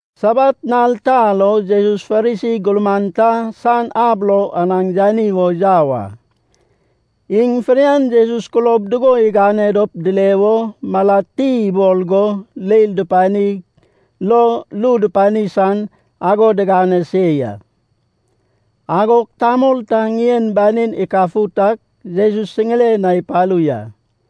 Sabat nal ta lo Jesus Farisi gurman ta san ab lo anaŋ yani wo yau a. Iŋ fidian Jesus kulob dugo igane dop dile wo malad ti ibol go leil dupanig lo ru dupani san ago digane se ya. Agog tamol ta ŋien banin ikafut ak Jesus siŋiren na ipalu ya.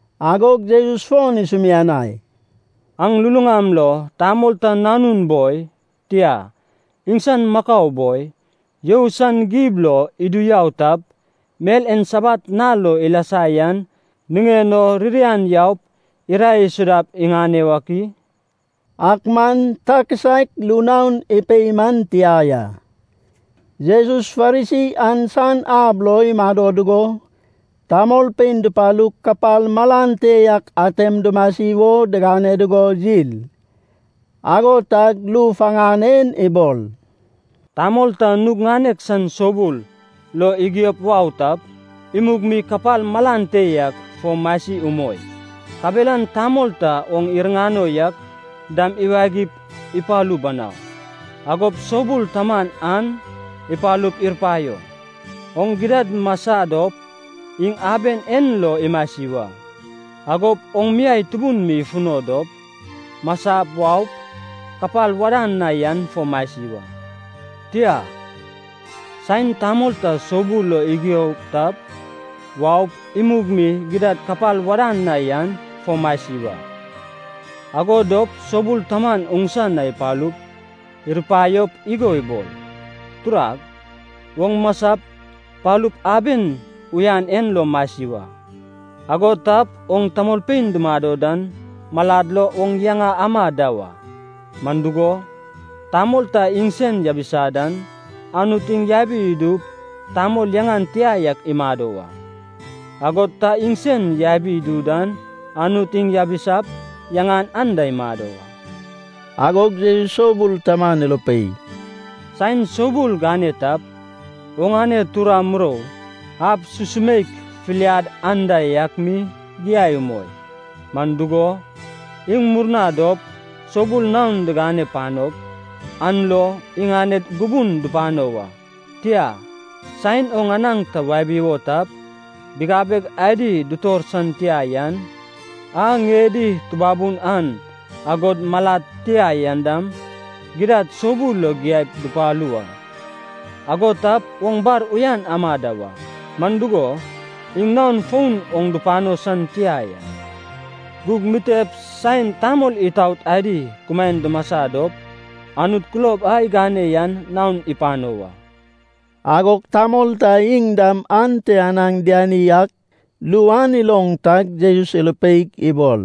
Agog Jesus fon isumianai, “Aŋ luluŋam lo tamol ta nanun boi, tia, iŋsan makau boi, you san gib lo idu yau tap, mel en Sabat nal lo ilasa yan niŋen o, ririan yaup irae isudap iŋane wak i?” Ak man ta kisaek ru naon ipei man tia ya. Jesus Farisi an san ab lo imado dugo, tamolpein dupalug kapal malan te yak atem dumasi wo digane dugo yil. Ago tag ru faŋan en ibol, “Tamol ta nug ŋanek san soubul lo igiop wau tap, imug mi kapal malan te yak fo masi umoi. Kabelan tamol ta oŋ iriŋano yak dam iwagip ipalu banau. Agop soubul taman an ipalup irupaio, ‘Oŋ gidad masa dop, iŋ aben en lo imasi wa.’ Agop oŋ miai tubun mi ifuno dop, masap waup, kapal wadan na yan fo masi wa. Tia. Saen tamol ta soubul lo igio tap, waup, imug mi gidad kapal wadan na yan fo masi wa. Ago dop soubul taman oŋsa na ipalup, irupaiop igo ibol, ‘Turag, oŋ masap palup aben uyan en lo masi wa.’ Ago tap oŋ tamolpein dumado dan malad lo oŋ yaŋa ama da wa. Man dugo, tamol ta iŋsen yabisa dan, Anut iŋ yabi idup tamol yaŋan tia yak imado wa. Agod ta iŋsen yabi idu dan Anut iŋ yabisap yaŋan anda imado wa.” Agog Jesus soubul taman irupei, “Saen soubul gane tap, oŋane tura, murou, ab susumeik, filiad anda yak mi giai umoi. Man dugo, iŋ murna dop soubul naon digane panop, an lo iŋaned gubun dupano wa. Tia, saen oŋ anaŋ ta wabi wo tap, bigabeg adi, dutor san tia yan, a ŋiedi tubabunan, agod malad tia an dam, gidad soubul lo giaip dupalu wa. Ago tap oŋ bar uyan ama da wa. Man dugo, iŋ naon fon oŋ dupano san tia ya. Gug mitep saen tamol itaot adi kumaen dumasa dop, Anut kulob a gane yan naon ipano wa.” Agog tamol ta iŋ dam ante anaŋ diani ak ru an iloŋ tag Jesus irupeig ibol,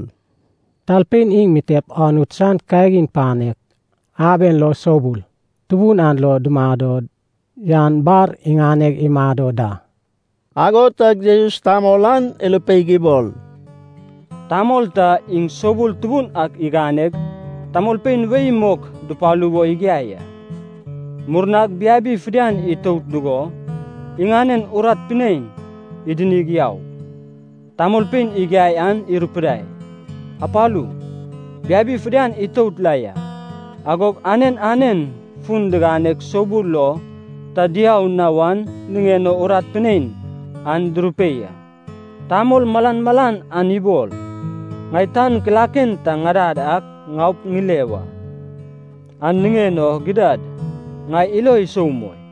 “Talpein iŋ mitep Anut san kagin panek aben lo soubul tubun an lo dumado yan bar iŋaneg imado da.” Ago tag Jesus tamol an irupeig ibol, “Tamol ta iŋ soubul tubun ak iganeg, tamolpein wei mok dupalu wo igiai a. Murnag biabi fidian itout dugo iŋanen urat pinein idinig yaug, tamolpein igiai an irupidai, ‘Apalu, biabi fidian itout la ya.’ Agog anen anen fun diganeg soubul lo ta diau na wan niŋen o urat pinein an durupei a. Tamol malan malan an ibol, ‘Ŋai tan kilaken ta ŋadad ak ŋaup ŋile wa. An niŋen o gidad, ŋai ilo isou umoi.’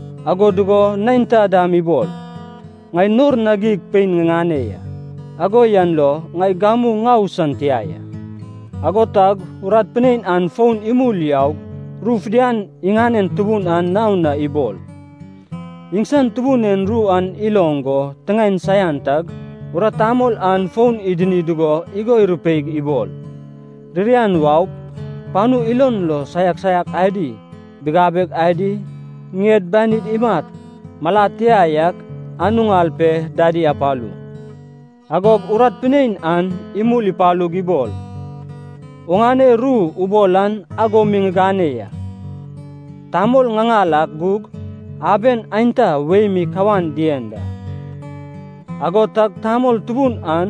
Ago dugo neinta dam ibol, ‘Ŋai nor na geig pein ŋiŋane ya. Ago yan lo ŋai gamu ŋau san tia ya.’” “Ago tag urat pinein an fon imul yaug ru fidian iŋanen tubun an naon na ibol. Iŋsan tubun en ru an iloŋ go tiŋaen saian tag, urat tamol an fon idini dugo igo irupeig ibol, ‘Ririan waup, panu ilon lo saiak saiak adi, bigabeg adi, ŋied banid imat, malad tia yak, an uŋal pe dadi apalu.’” “Agog urat pinein an imul ipalug ibol, ‘Oŋane ru ubol an ago mi ŋigane ya. Tamol ŋaŋal ak gug aben aenta wei mi kawan dien da.’” “Ago tag tamol tubun an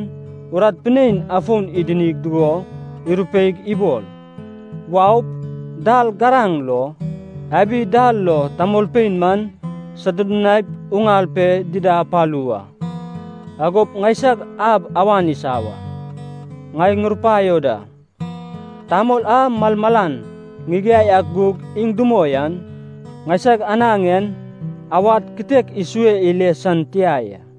urat pinein afon idini dugo irupeig ibol, ‘Waup, dal garaŋ lo, abi dal lo tamolpein man sodudunaip uŋal pe dida apalu wa. Agop ŋaisag ab awan isa wa.’ Ŋai ŋurupaio da, tamol a malmalan ŋigiai ak gug iŋ dumoi an, ŋaisag anaŋ en awad kitek isue ile san tia ya.”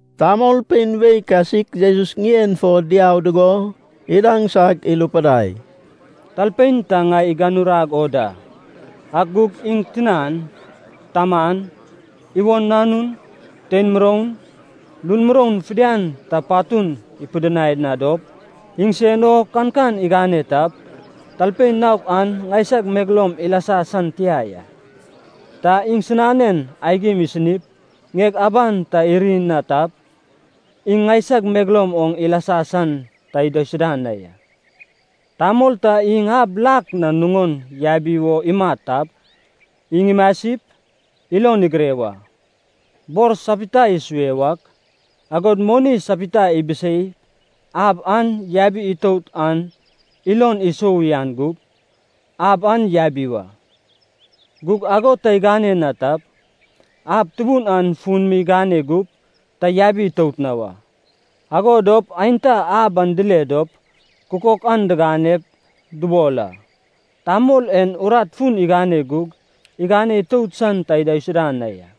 Tamolpein wei kasik Jesus ŋien fo diau dugo idaŋsag irupidai, “Talpein ta ŋai iganurag o da, ak gug iŋ tinan, taman, iwon nanun, tein muroun, lun muroun fidian ta patun ipidinai na dop, iŋsen o kankan igane tap, talpein naok an ŋaisag megeloum ilasa san tia ya. Ta iŋsinanen aigim isinip, ŋieg aban ta iri na tap, iŋ ŋaisag megeloum oŋ ilasa san ta idaisuda na ya. “Tamol ta iŋ ab lak na nuŋon yabi wo imat tap, iŋ imasip, ilon igire wa. Bor sapita isue wak, agod moni sapita ibiseip ab an yabi itout an ilon isou uyan gup, ab an yabi wa. Gug ago ta igane na tap, ab tubun an fun mi igane gup ta yabi itout na wa. Ago dop aenta ab an dile dop, kukok an diganep dubol a, ‘Tamol en urat fun igane gug igane itout san ta idaisuda na ya.’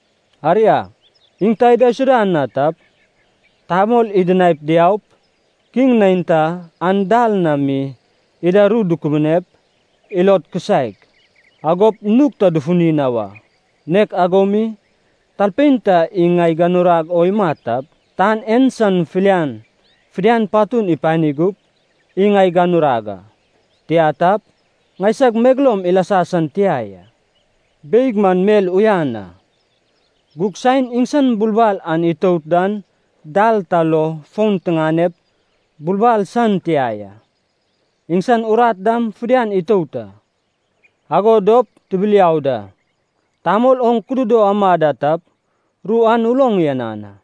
Aria, iŋ ta idaisuda na tap, tamol idinaip diaup, kiŋ neinta an dal na mi ida ru dukubunep, ilod kisaek, agop nug ta dufuni na wa. Nek ago mi, talpein ta iŋ ŋai iganurag o imat tap, tan en san filian fidian patun ipani gup, iŋ ŋai iganurag a. Tia tap, ŋaisag megeloum ilasa san tia ya. “Beig man mel uyan a. Gug saen iŋsan bulbal an itout dan dal ta lo fon tiganep, bulbal san tia ya. Iŋsan urat dam fidian itout a. Ago dop tibiliau da. Tamol oŋ kududo ama da tap, ru an uloŋ uyanan a.”